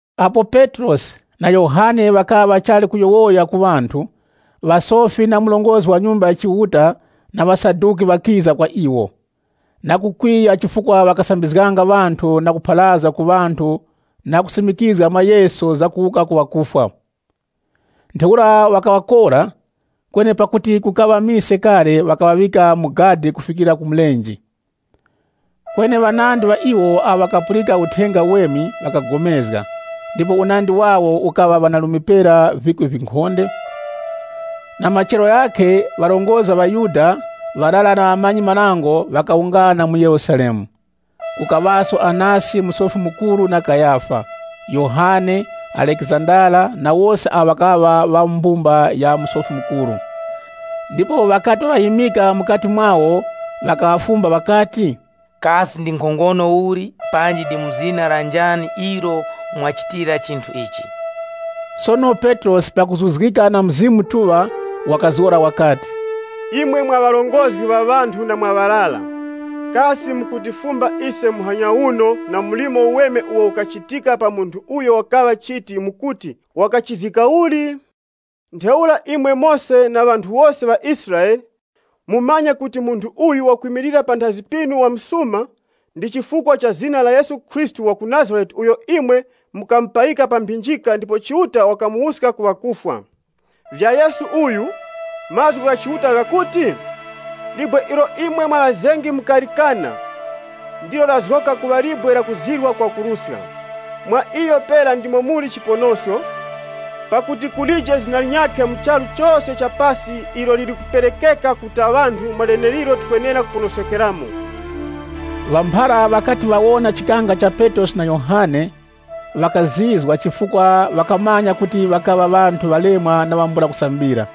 Apo Petrosi na Yohane ŵakaŵa ŵachali kuyowoya ku ŵanthu, ŵasofi na murongozgi wa Nyumba ya Chiuta, na Ŵasaduki, ŵakiza kwa iwo, na kukwiya chifukwa ŵakasambizganga ŵanthu na kupharazga ku ŵanthu na kupanikizga mwa Yesu za kuwuka ku ŵakufwa. Ntheura ŵakaŵakora, kweni pakuti kukaŵa mise kale ŵakaŵaŵika mu gadi kufikira ku mulenje. Kweni ŵanandi ŵa iwo awo ŵakapulika Uthenga Uweme ŵakapulikana, ndipo unandi wawo ukaŵa ŵanarume pera vikwi vinkhonde. Na machero ghakhe ŵarongozgi ŵa ŵaYuda, ŵarara na ŵamanyi-marango ŵakawungana mu Yerusalemu. Kukaŵaso Anasi Musofi Mukuru na Kayafa, Yohane, Alekizandara na wose awo ŵakaŵa ŵa mu mbumba ya Musofi Mukuru. Ndipo ŵakati ŵaŵayimika mukati mwawo, ŵakaŵafumba ŵakati, “Kasi ndi nkhongono uli panji ndi mu zina la njani ilo mwachitira chinthu ichi?” Sono Petrosi pakuzuzgika na Mzimu Mutuŵa wakazgora wakati, “Imwe ŵarongozgi ŵa ŵanthu na mwa ŵarara, kasi mukutifumba ise muhanya uno na mlimo uweme uwo ukachitika pa munthu uyo wakaŵa chiti, mukuti, wakachizgika uli? Ntheura imwe mose na ŵanthu wose ŵaIsraele, mumanye kuti munthu uyu wakwimilira panthazi pinu wa msuma, ndi chifukwa cha zina la Yesu Khristu wa ku Nazarete uyo imwe mukamupayika pa mphinjika ndipo Chiuta wakamuwuska ku ŵakufwa. Vya Yesu uyu, mazgu gha Chiuta ghakuti, ‘Libwe ilo imwe mwa ŵazengi mukalikana, ndilo lazgoka nkhorezgero ya chingodya.’ Mwa iyo pera ndimo muli chiponosko, pakuti kulije zina linyakhe mu charu chose cha pasi ilo liri kuperekeka ku ta ŵanthu mwa leneilo tikwenera kuponoskekeramo.” Ŵa mphara ŵakati ŵawona chikanga cha Petrosi na Yohane, ŵakazizwa chifukwa ŵakamanya kuti ŵakaŵa ŵanthu ŵalemwa na ŵambula kusambira.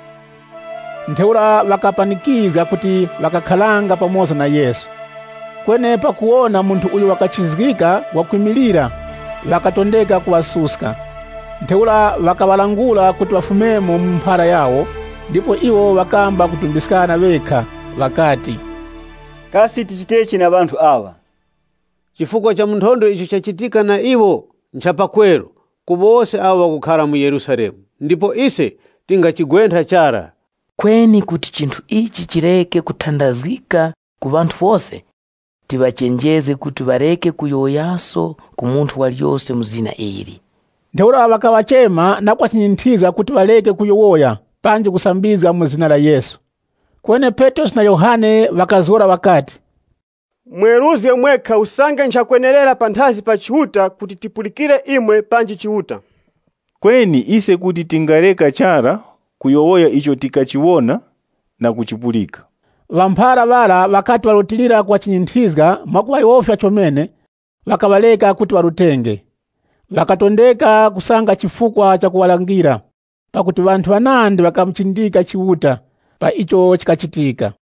Ntheura ŵakapanikizga kuti ŵakakharanga pamoza na Yesu. Kweni pakuwona munthu uyo wakachizgika wakwimilira, ŵakatondeka kuŵasuska. Ntheura ŵakaŵalangula kuti ŵafumemo mu mphara yawo, ndipo iwo ŵakamba kudumbiskana ŵekha, ŵakati, “Kasi tichitechi na ŵanthu aŵa? Chifukwa chamunthondwe icho chachitika na iwo ncha pakweru ku wose awo ŵakukhara mu Yerusalemu, ndipo ise tingachigwentha chara. Kweni kuti chinthu ichi chireke kutandazgika ku ŵanthu wose, tiŵachenjezge kuti ŵareke kuyowoyaso ku munthu waliyose mu zina ili.” Ntheura ŵakaŵachema na kuŵachinyinthizga kuti ŵareke kuyowoya, panji kusambizga mu zina la Yesu. Kweni Petrosi na Yohane ŵakazgora ŵakati, “Mweruzge mwekha usange nchakwenerera panthazi pa Chiuta kuti tipulikire imwe panji Chiuta. Kweni ise kuti tingareka chara kuyowoya icho tikachiwona na kuchipulika.” Ŵa mphara ŵara ŵakati ŵarutilira kuŵachinyinthizga mwakuŵawofya chomene, ŵakaŵareka kuti ŵarutenge. Ŵakatondeka kusanga chifukwa chakuŵalangira, pakuti ŵanthu ŵanandi ŵakamuchindika Chiuta, pa icho chikachitika.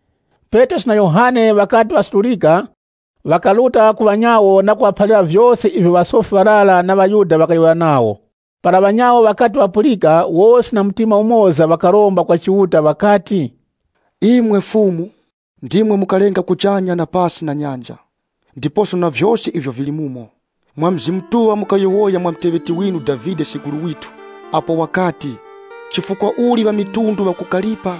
Petrosi na Yohane ŵakati ŵasutulika, ŵakaruta ku ŵanyawo na kuŵaphalira vyose ivyo ŵasofi ŵarara na ŵaYuda ŵakayowoya nawo. Para ŵanyawo ŵakati ŵapulika, wose na mtima umoza ŵakaromba kwa Chiuta, ŵakati, “Imwe Fumu, ndimwe mukalenga kuchanya na pasi na nyanja, ndiposo na vyose ivyo vilimumo. Mwa Mzimu Mutuŵa mukayowoya mwa muteŵeti winu Davide sekuru withu, apo wakati, ‘Chifukwa uli ŵamitundu ŵakukaripa?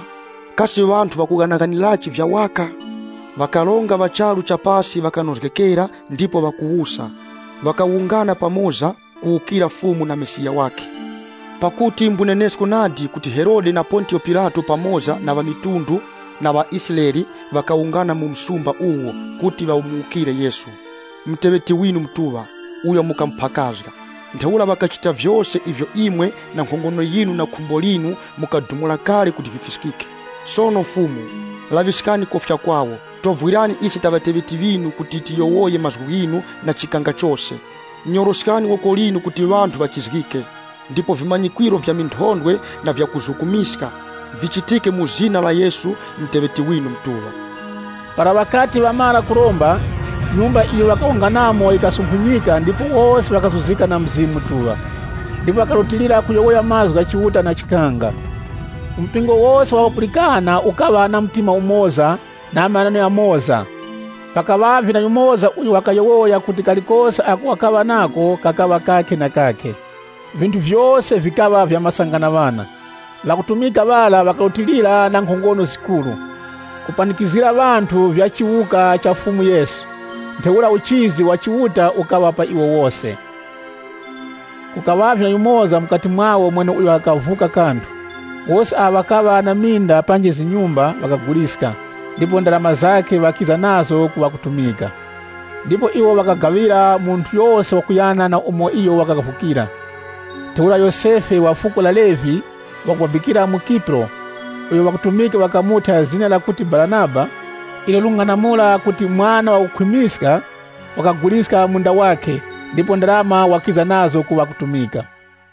Kasi nchifukwa uli ŵanthu ŵakupangana vyawakawaka? (LXX) Ŵakaronga ŵa charu cha pasi ŵakanozgekera ndipo ŵakuwusa, ŵakapangana pamoza kwimikana na Fumu na Mesiya wakhe.’ Pakuti mbunenesko nadi kuti Herode na Pontiyo Pilato pamoza na ŵamitundu na ŵaIsraele ŵakawungana mu msumba uwu kuti ŵamuwukire Yesu, Muteŵeti winu Mutuŵa, uyo mukamuphakazga. Ntheura ŵakachita vyose ivyo imwe na nkhongono yinu na khumbo linu mukadumula kale kuti vifiskike. Sono Fumu, laŵiskani kofya kwawo, tovwirani ise ta ŵateŵeti ŵinu kuti tiyowoye mazgu ghinu na chikanga chose. Nyoroskani woko linu kuti ŵanthu ŵachizgike, ndipo vimanyikwiro vya minthondwe na vyakuzukumiska vichitike mu zina la Yesu muteŵeti winu mutuŵa.” Para ŵakati ŵamara kuromba, nyumba iyo ŵakawunganamo yikasunkhunyika ndipo wose ŵakazuzgika na Mzimu Mutuŵa, ndipo ŵakarutilira kuyowoya mazgu gha Chiuta na chikanga. Mpingo wose wa ŵakupulikana ukaŵa na mtima umoza, na maghanoghano ghamoza. Pakaŵavye na yumoza uyo wakati pa kalikose ka vinthu ivyo wakaŵa navyo kakaŵa kakhe na kakhe. Vinthu vyose vikaŵa vya masanganaŵana. Ŵakutumika ŵara ŵakarutilira na nkhongono zikuru, kupanikizgira ŵanthu vya chiwuka cha Fumu Yesu. Ntheura uchizi wa Chiuta ukaŵa pa ŵanthu wose. Kukaŵavye na yumoza mukati mwawo mweneuyo wakakavuka kanthu. Wose awo ŵakaŵa na minda panji zinyumba, ŵakaguliska, ndipo ndarama zakhe ŵakiza nazo ku ŵakutumika. Ndipo iwo ŵakagaŵira munthu yose kwakuyana na umo iyo wakakavukira. Ntheura Yosefe, wa fuko la Levi, wakubabikira mu Kipuro, uyo ŵakutumika ŵakamuthya zina lakuti Baranaba (ilo likung'anamula kuti, “Mwana wakukhwimiska”), wakaguliska munda wakhe, ndipo ndarama wakiza nazo ku ŵakutumika.